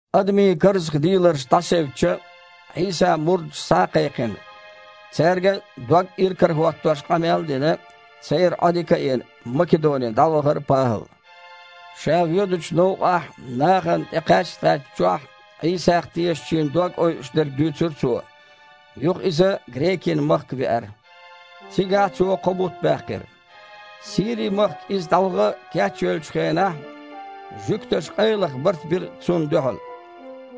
Адамийн карзахдийларш дІасевцча, Іийсан мурдаш схьа а кхайкхина, цаьрга дог иракарахІоттош къамел а дина, церан Іодика а йина, Македоне дІавахара ПахІал. Ша воьдучу новкъахь нахана тІекхаьч-кхаьчначохь Іийсах тешачийн дог ойуш дерг дуьйцура цо. Юха иза грекийн махка веара. Цигахь цо кхо бутт баьккхира. Сири-махка иза дІаваха кечвеллачу хенахь жуьгташа къайлаха барт бира цунна дуьхьал.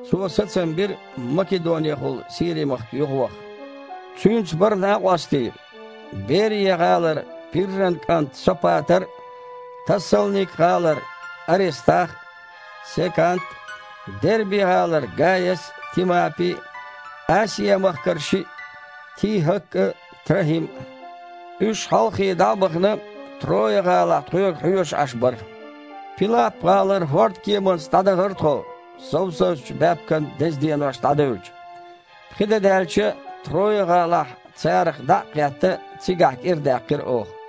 Цо сацам бира, Македонехула Сири-махка юхаваха. Цуьнца бара накъостий: Берия-гІалара Пирран кІант Сопатар а, Тассалник-гІалара Арестах а, Секант а, Дерби-гІалара Гаяс а, Тимапи а, Асиа-махкара шиъ – ТихІак а, ТрахІим а. Уьш, хьалххе дІа а бахана, Трой-гІалахь тхоьга хьоьжуш Іаш бара. Пилап-гІалара хІордан кеманца дІадахара тхо, совсазчу баьпкан деза денош дІадевлча. Пхи де даьлча, Трой-гІалахь царах дІа а кхетта, цигахь кІира даьккхира оха.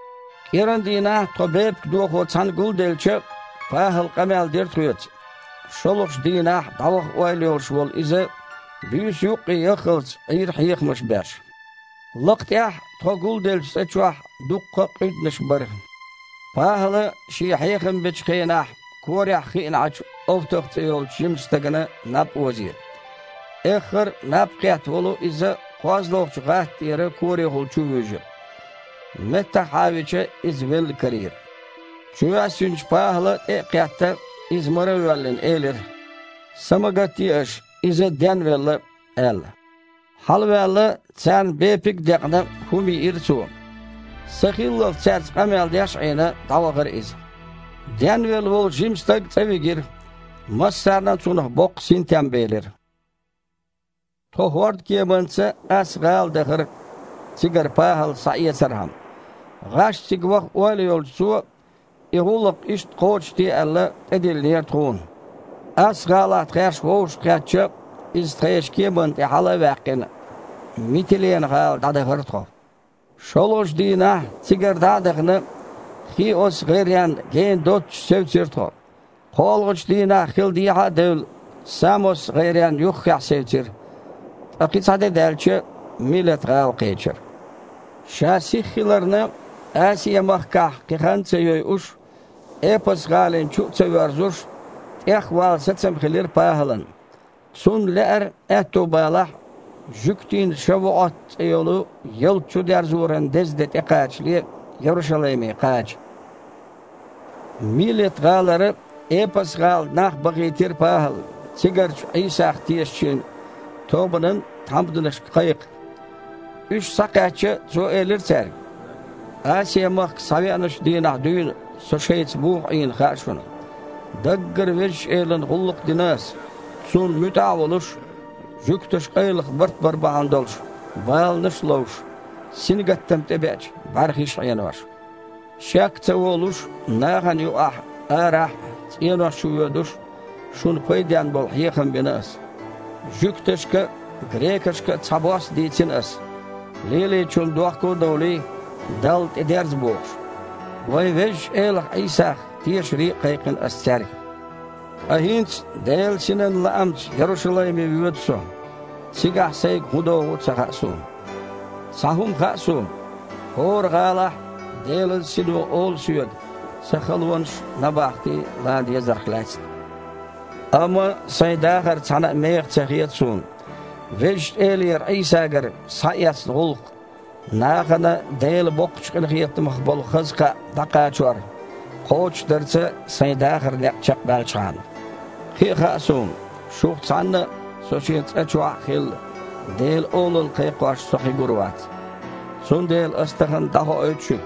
КІийрандийнахь тхо бепиг дохо цхьаьна гулделча, ПахІала къамел дира тхоьца. ШолгІачу дийнахь дІаваха ойла йолуш волу иза буьйса юккъе яххалц Іийра хьехамаш беш. Лакха тІехь, тхо гулделлачу цІа чохь, дуккха а къуьданаш яра. ПахІала шен хьехам бечу хенахь корехь хиъна Іачу Овтах цІе йолчу жимачу стагана наб озийра. Эххар а наб кхетта волу иза кхозлагІчу гІат тІера корехула чувуьйжира. Меттахъхьавича, иза велла карийра. Чувоьссинчу ПахІала, тІе а кхетта, иза мара а воьллина, элира: «Са ма гатде аша, иза денвелла», – аьлла. Хьалаваьлла, царна бепиг а декъна, хІума йиира цо. Сахиллалц цаьрца къамел деш а Іийна, дІавахара иза. Денвелла волу жима стаг цІа вигира. Массарна а цунах боккха синтем белира. Тхо хІордан кеманца Асс-гІала дахара цигара ПахІал схьаэцархьама. ГІаш цига ваха ойла йолчу цо, и гІуллакх иштта кхочушде аьлла, тІедиллинера тхуна. Асс-гІалахь тхаьш вовшахкхетча, иза тхешан кеманна тІе хьала а ваьккхина, Митилена-гІала дІадахара тхо. ШолгІачу дийнахь цигара дІа а дахана, Хиос-гІайренна гена доццуш севцира тхо. КхоалгІачу дийнахь, хил дехьа а девлла, Самос-гІайрен юххехь севцира, ткъа кхин цхьа де даьлча, Милет-гІала кхечира. Ша сиха хиларна, Асиа-махкахь кхин хан а ца йойуш, Эпас-гІалина чу а ца воьрзуш, тІехвала сацам хилира ПахІалан. Цунна лаьара, аьтто балахь, жуьгтийн ШавуІот цІе йолу ялта чудерзоран деза де тІекхачале Ярушалайме кхача. Милет-гІалара Эпас-гІала нах бахийтира ПахІала цигарчу Іийсах тешачийн тобанан тхьамданашка кхайкха. Уьш схьакхаьчча, цо элира цаьрга: «Асиа-махка схьавеъначу дийнахь дуьйна со шайца муха Іийна хаьа шуна. Даггара Везачу Элана гІуллакх дина ас, Цунна муьтІахь а волуш, жуьгташа къайлаха барт бар бахьана долуш, баланаш а ловш, сингаттам тІебеача, бІаьрхиш а Іенош. Шек а ца волуш, нахана юкъахь, арахь а, цІенош чу воьдуш а, шуна пайденна болу хьехам бина ас. Жуьгташка а, грекашка а цхьабосса дийцина ас, лелийначунна дохко а довлий, Далла тІедерза бохуш. Вайн Везачу Элах Іийсах тешаре а кхайкхина ас цаьрга. Ткъа хІинца Делан Синан лаамца Ярушалайме воьду со. Цигахь сайга хІун догІу а ца хаьа суна. Цхьа хІума хаьа суна, хІора гІалахь а Делан Сино олу соьга сан халонаш а, набахти а лан дезарх лаьцна. Амма сайн дахар цхьана а меха ца хета суна, Везачу Элера Іийсагара схьаэцна гІуллакх – нахана Делан боккхачу къинхетамах болу хаза кхаъ дІакхачор – кхочушдарца сайн дахаран некъ чекхбаьлчхьана. Кхин а хаьа суна, шух цхьанна а – со шен цІа чохь а хилла, Делан олалла кхайкхош со кхин гур вац. Цундела ас тахана дІахоуьйту шуьга,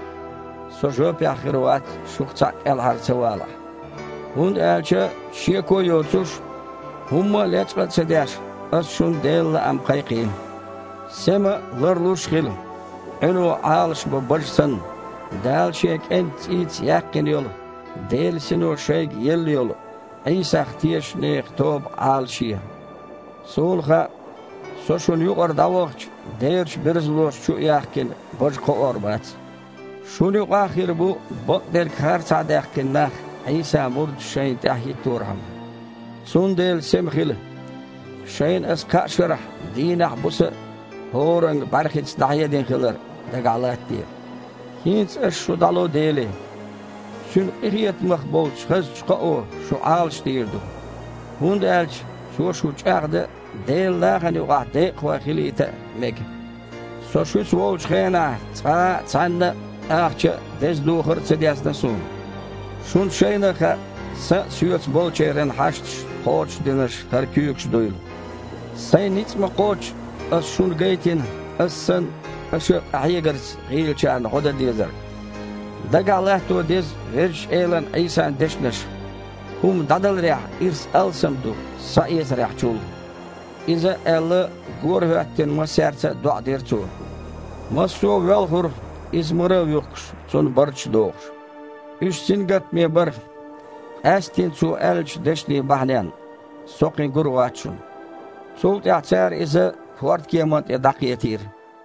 со жоьпехь хир вац, шух цхьаъ кІелхьара ца валахь, хІунда аьлча, шеко а йоцуш, хІумма а лечкъа а ца деш, ас шуна Делан лаам кхайкхийна. Сема а, ларлуш а хила. Іуьно Іалашбо бажа санна, Дала Шен КІентан цІийца яьккхина йолу, Делан Сино шайга елла йолу Іийсах тешачу нехан тоба Іалашъе. Суна хаьа, со шуна юкъара дІавахча, дерачу берзалоша, чу а яьхкина, бажа кхоор бац. Шуна юкъахь а хир бу бакъдерг харцахьадаьккхина нах, Іийсан мурдаш шайн тІаьхьа хІитторхьама. Цундела сема хила. Шайна аса кхаа шарахь дийнахь а, буса а хІоранга а бІаьрхица дІахьедина хилар дагахь латтаде. ХІинца ас шу дІало Деле. Цуьнан къинхетамах болчу хазачу кхоо шу Іалашдийр ду, хІунда аьлча цо шу чІагІдан а, Делан нахана юкъахь декъахой хилийта а мега. Со шуьца волчу хенахь цкъа а цхьаннан а ахча а, деза духар а ца дезна суна. Шуна шайна а хаьа, сан а, соьца болчеран а хьашташ кхочушдинарш хІара куьйгаш дуйла. Сайн ницкъ ма-кхоччу, ас шуна гайтина, ас санна, аша а къахьегарца гІийлачарна гІо дан дезар. Дагахь латто деза Везачу Элан Іийсан дешнаш: „ХІума дІадаларехь ирс алсам ду схьаэцарехь чул“». Иза а аьлла, горахІоьттина, массаьрца а доІа дира цо. Массо а воьлхура, иза мара а вуьхкуш, цунна барташ а дохуш. Уьш сингаттаме бара, къаьсттина цо аьллачу дешнийн бахьаненна: «Со кхин гур вац шуна». Цул тІаьхьа цара иза хІордан кеманна тІе дІакхетийра.